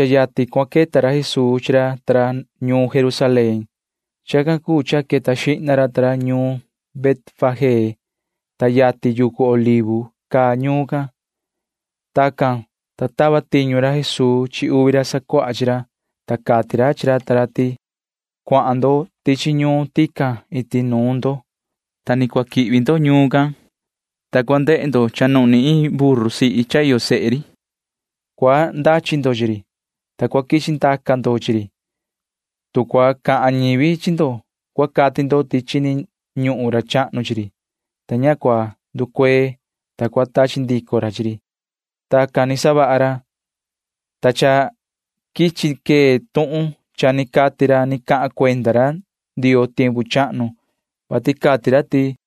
Yatin cua queta ra Jesuu ta ra ñuun Jerusalén. Chacan cuu cha queta xihna ra ta ra ñuun Betfagé, ta yatin yucu Olivo caa ñuun can. Tacan, ta tava tiñu ra Jesuu chi uvi ra sacuaha chi ra, ta cati ra chi ra ta ra ti: ―Cuahan ndo tichi ñuun tican iti nuun ndo. Sa cua quihvi ndo ñuun can, ta cha cua ndehe ndo cha nuhni iin buru, ta iyo sehe ri chi ri. Cua ndachi ndo chi ri, ta cua quichi ndaca ndo chi ri. Tu cua cahan ñivi chi ndo, cua cati ndo ti chini ñuhun ra chahnu chi ri, ta ña cua nducuee, ta cua tachi ndico ra chi ri ―cati ra chi ra ta ra. Tacan ni savaha ra, ta cha quichi quee tuhun cha ni cati ra ni cahan cuenda ra Ndioo tiempu chahnu, vati cati ra ti: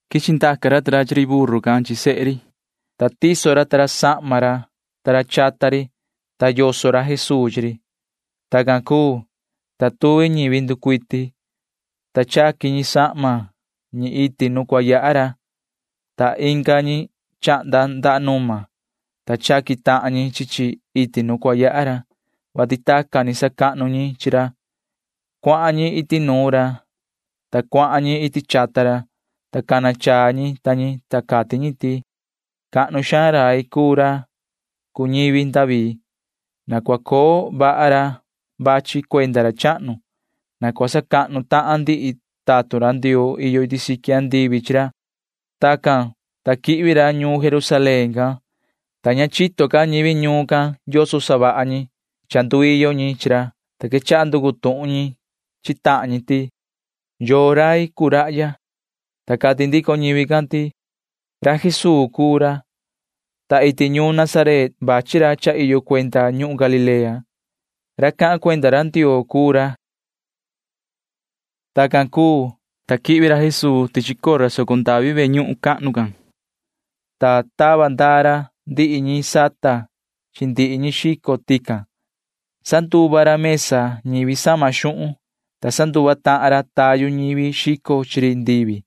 Quichi ndaca ra ta ra chi ri buru can chi sehe ri, ta tiso ra ta ra sahma ra ta ra chata ri, ta yoso ra Jesuu chi ri. Tacan cuu, ta tuvi ñivi nducuiti, ta chaqui ñi sahma ñi iti nu cua yaha ra, ta inga ñi chahnda ndaha numa, ta chaqui tahan ñi chi chi iti nu cua yaha ra, [vati tacan ni sacahnu ñi chi ra]. Cuahan ñi iti nuun ra, ta ndicu ñi iti chata ra, ta cana chaa ñi ta ñi. Cati ñi ti: ―¡Cahnu xaan rai cuu ra cuu ñivi David! ¡Na cua coo vaha ra vachi cuenda ra chahnu! ¡Na cua sacahnu tahan ndihi tatun Ndioo iyo iti siqui andivi chi ra! ―cati ñi ta ñi. Tacan, ta quihvi ra ñuun Jerusalén can, ta jihna cha ña chito ca ndihi ñivi ñuun can yoso savaha ñi cha nduiyo ñi chi ra, ta quechaha nducu tuhun ñi chi tahan ñi ti: ―¿Yoo rai cuu rahya? ―cati ñi. Ta cati ndico ñivi can ti: ―Ra Jesuu cuu ra, ta vachi ra iti ñuun Nazaret cha iyo cuenda ñuhun Galilea. Ra cahan cuenda ra Ndioo cuu ra ―cati ñi ta ñi. Tacan cuu, ta quihvi ra Jesuu tichi cora soco ndavi ve ñuhun cahnu can, ta tava ndaa ra ndihi ñi sata chi ndihi ñi xico tican. Sanduva ra mesa ñivi sama xuhun, ta sanduva tahan ra tayu ñivi xico chi ri ndivi,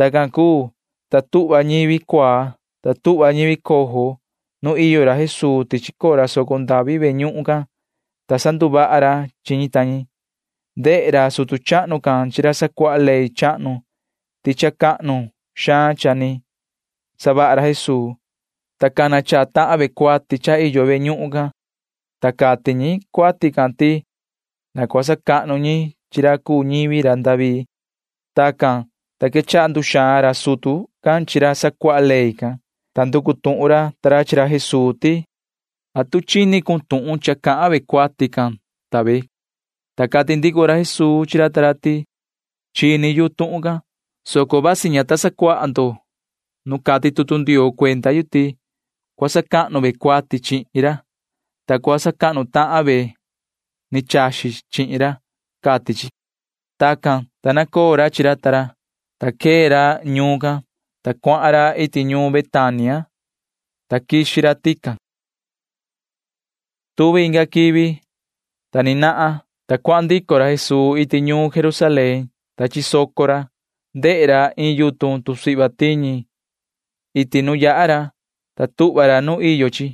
Tacan cuu, ta tuhva ñivi cuaa, tuhva ñivi coho nu iyo ra Jesuu tichi cora soco ndavi ve ñuhun can, ta sanduvaha ra chi ñi ta ñi. Ndehe ra sutu chahnu can chi ra sacuaha ley chahnu ti cha cahnu xaan ni savaha ra Jesuu, ta cha cana chaa tahan ñi cuati cha iyo ve ñuhun, ta cati ñi cuati can ti na cua sacahnu ñi chi ra cuu ñivi ra David, cati ra ta ra. Tacan, ta quechaha nduxaan ra sutu can chi ra sacuaha ley can, ta nducu tuhun ra ta ra chi ra Jesuu ti: ―¿Atu chini cun tuhun cha cahan ra ta ra? ―cati ra ta ra. Ta cati ndico ra Jesuu chi ra ta ra ti: ―Chini yu tuhun can, soco vasi ña ta sacuaha ndo nu cati tutu Ndioo cuenda yu ti: Cua sacahnu ñi cuati chihin ra, ta cua sacahnu tahan ve ni chaxi chihin ra, cati chi ―cati ra. Tacan, ta nacoo ra chi ra ta ra, ta quee ra ñuun can, ta cuahan ra iti ñuun Betania, ta quixi ra tican. Tuvi inga quivi, ta ni nahan vihi, ta cuahan ndico ra Jesuu iti ñuun Jerusalén, ta chisoco ra. Ndehe ra iin yutun tusihva tiñi iti nu yaha ra, ta tuhva ra nu iyo chi,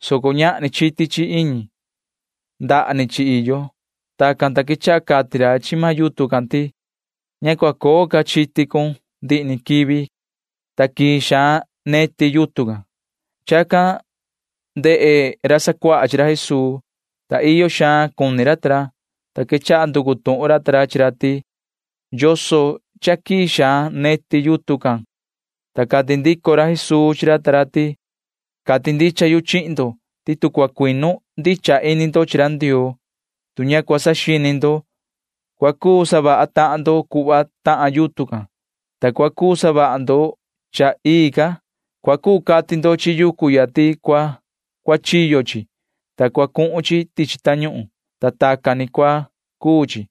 soco ñahni chiti chi iñi. Ndaha ni chi iyo. Tacan, ta quechaha cati ra chi maan yutun can ti: ―Ña cua coo ca chiti cun ndihi ni quivi ―cati ra chi run. Ta quii xaan neti maan yutun can. Chacan ndehe ra sacuaha chi ra Jesuu, ta iyo xaan cuni ra ta ra, ta quechaha nducu tuhun ra ta ra chi ra ti: ―¿Yoso neti yutun can cha quii quii ni? ―cati ra. Ta cati ndico ra Jesuu chi ra ta ra ti: ―Cati ndicha yu chihin ndo ti tu cua cuinu ndicha ini ndo chi ra Ndioo, tu ña cua saxini ndo, cua cuu savaha tahan ndo cuhva tahan yutun can, ta cua cuu savaha ndo cha ii ca. Cua cuu cati ndo chi yucu ya ti cua cuachiyo chi, ta cua cuhun chi tichi tañuhun, ta tacan ni cua cuu chi.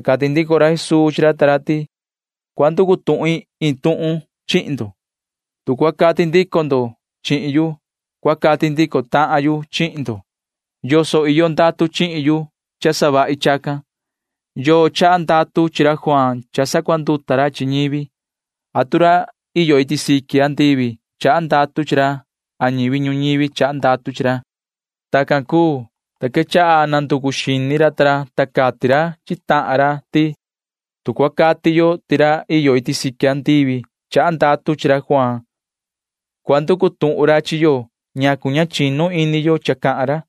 Ta cati ndico ra Jesuu chi ra ta ra ti: ―Cua nducu tuhin iin tuhun chihin ndo. Tu cua cati ndico ndo chihin yu, cua cati ndico tahan yu chihin ndo yoso iyo ndatu chihin yu cha savahi chacan. ¿Yoo chaha ndatu chi ra Juaan cha sacuanduta ra chi ñivi? ¿Atu chaha ra iyo iti siqui andivi ndatu chi ra a chaha ñivi ñuñivi ndatu chi ra? ―cati ra Jesuu chi ra ta ra. Tacan cuu, ta quechaha nanducu xini ra chi tahan ra. Cati ra chi tahan ra ti: ―Tu cua cati yo ti ra iyo iti siqui andivi chaha ndatu chi ra Juaan, cua nducu tuhun ra chi yo ñacu ña chinu ini yo cha cahan ra.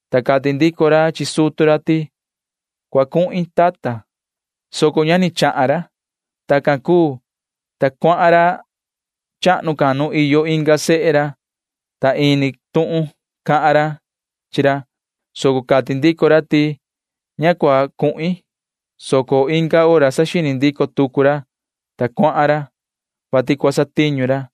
ta cati ndico ra chi sutu ra ti: “Cua cuhin, tata,” soco ña ni cuahan ra. Tacan cuu, ta cuahan ra chahnu can nu iyo inga sehe ra, ta ini tuhun cahan ra chi ra, soco cati ndico ra ti: “Ña cuhin,” soco inga hora saxini ndico tucu ra, ta cuahan ra, [vati cua satiñu ra].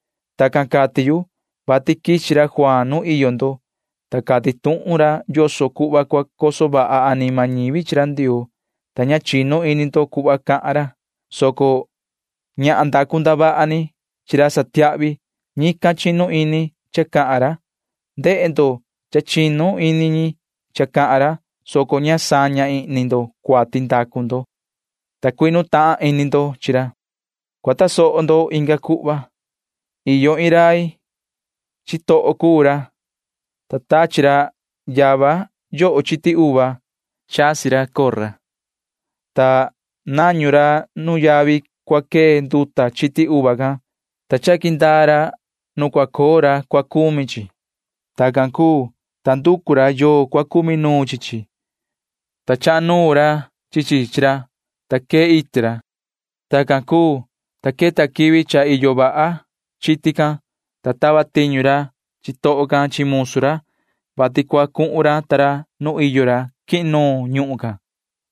Tacan cati yu, vati quichi ra Juaan nu iyo ndo, ta cati tuhun ra yoso cuhva cua coso vaha anima ñivi chi ra Ndioo, ta ña chinu ini ndo cuhva cahan ra, soco ñahan ndacu ndavaha ni chi ra satiahvi―ñican chinu ini cha cahan ra. Ndehe ndo cha chinu ini ñi cha cahan ra, soco ña saña ihni ndo cuati ndacu ndo, ta cuinu tahan ini ndo chi ra. [Ni vii cahan ra Jesuu chi racan ta ra:] ’Cua tasoho ndo inga cuhva. Iyo iin rai. Chitoho cuu ra, ta tachi ra yava yoho chiti uva. Chasi ra cora, ta nañu ra nu yavi cua quee nduta chiti uva can, ta chaqui ndaa ra nu cua coo ra cua cumi chi chi. ’Tacan cuu, ta nducu ra yoo ra cua cumi nuun chi chi, ta chaha nuun ra chi chi chi ra, ta quee iti ra. Tacan cuu, ta queta quivi cha iyo vaha chiti can, ta tava tiñu ra chitoho can chi musu ra, vati cua cuhun ra ta ra nu iyo ra quihin nuun ñuhun can,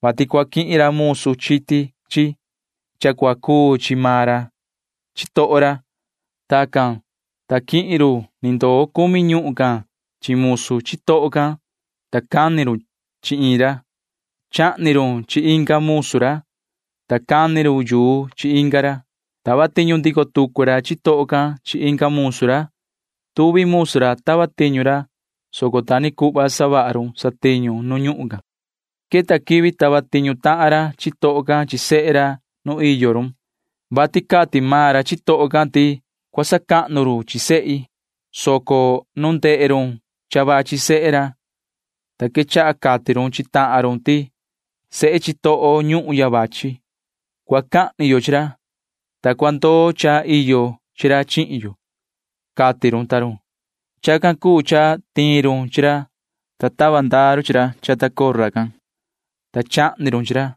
vati cua quihin ra musu chiti chi cha iyo chi maan ra cuu chitoho ra. Tacan, ta quihin run ni ndoo cumi ñuhun can chi musu chitoho can, ta cani run chi iin ra. Chahni run chi inga musu ra, ta cani run yuu chi inga ra. Tava tiñu ndico tucu ra chitoho can chi inga musu ra. Tuvi musu ra tava tiñu ra, soco ta ni cuhva savaha run satiñu nu ñuhun can. ’Queta quivi tava tiñu tahan ra chitoho can chi sehe ra nu iyo run, vati cati maan chitoho can ti: “Cua sacahnu run chi sehi,” soco ndehe run ti cha vachi sehe ra, ta quechaha cati run chi tahan run ti: “Sehe chitoho ñuhun ya vachi. Cua cahni yo chi rahya, ta cua ndoo cha iyo chi ra chihin yo,” cati run ta run. Chacan cuu cha tiin run chi ra, ta tava ndaa run chi ra chata cora can, ta chahni run chi ra.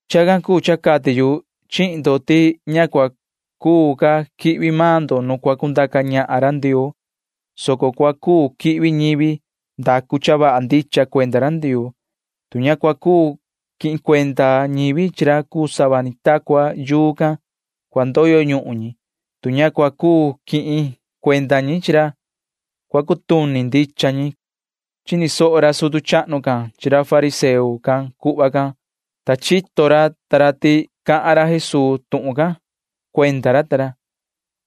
Chacan cuu cha cati yu chihin ndo ti ña cua cuu ca quihvi maan ndo nu cua cundaca ñahan ra Ndioo, soco cua cuu quihvi ñivi ndacu cha vaha ndicha cuenda ra Ndioo. Tu ña cua cuu quihin cuenda ñivi chi ra cuu sava ta cua yuu can, cua ndoyo ñuhun ñi. Tu ña cua cuu quihin cuenda ñi chi ra, cua cutuni ndicha ñi ―cati ra Jesuu. Chini soho ra sutu chahnu can chi ra fariseo can cuhva can, ta chito ra ta ra ti cahan ra Jesuu tuhun can cuenda ra ta ra.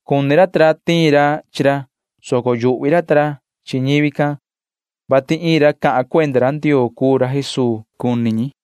Cuni ra ta ra tiin ra chi ra, soco yuhvi ra ta ra chi ñivi can, vati iin ra cahan cuenda ra Ndioo cuu ra Jesuu cuni ñi.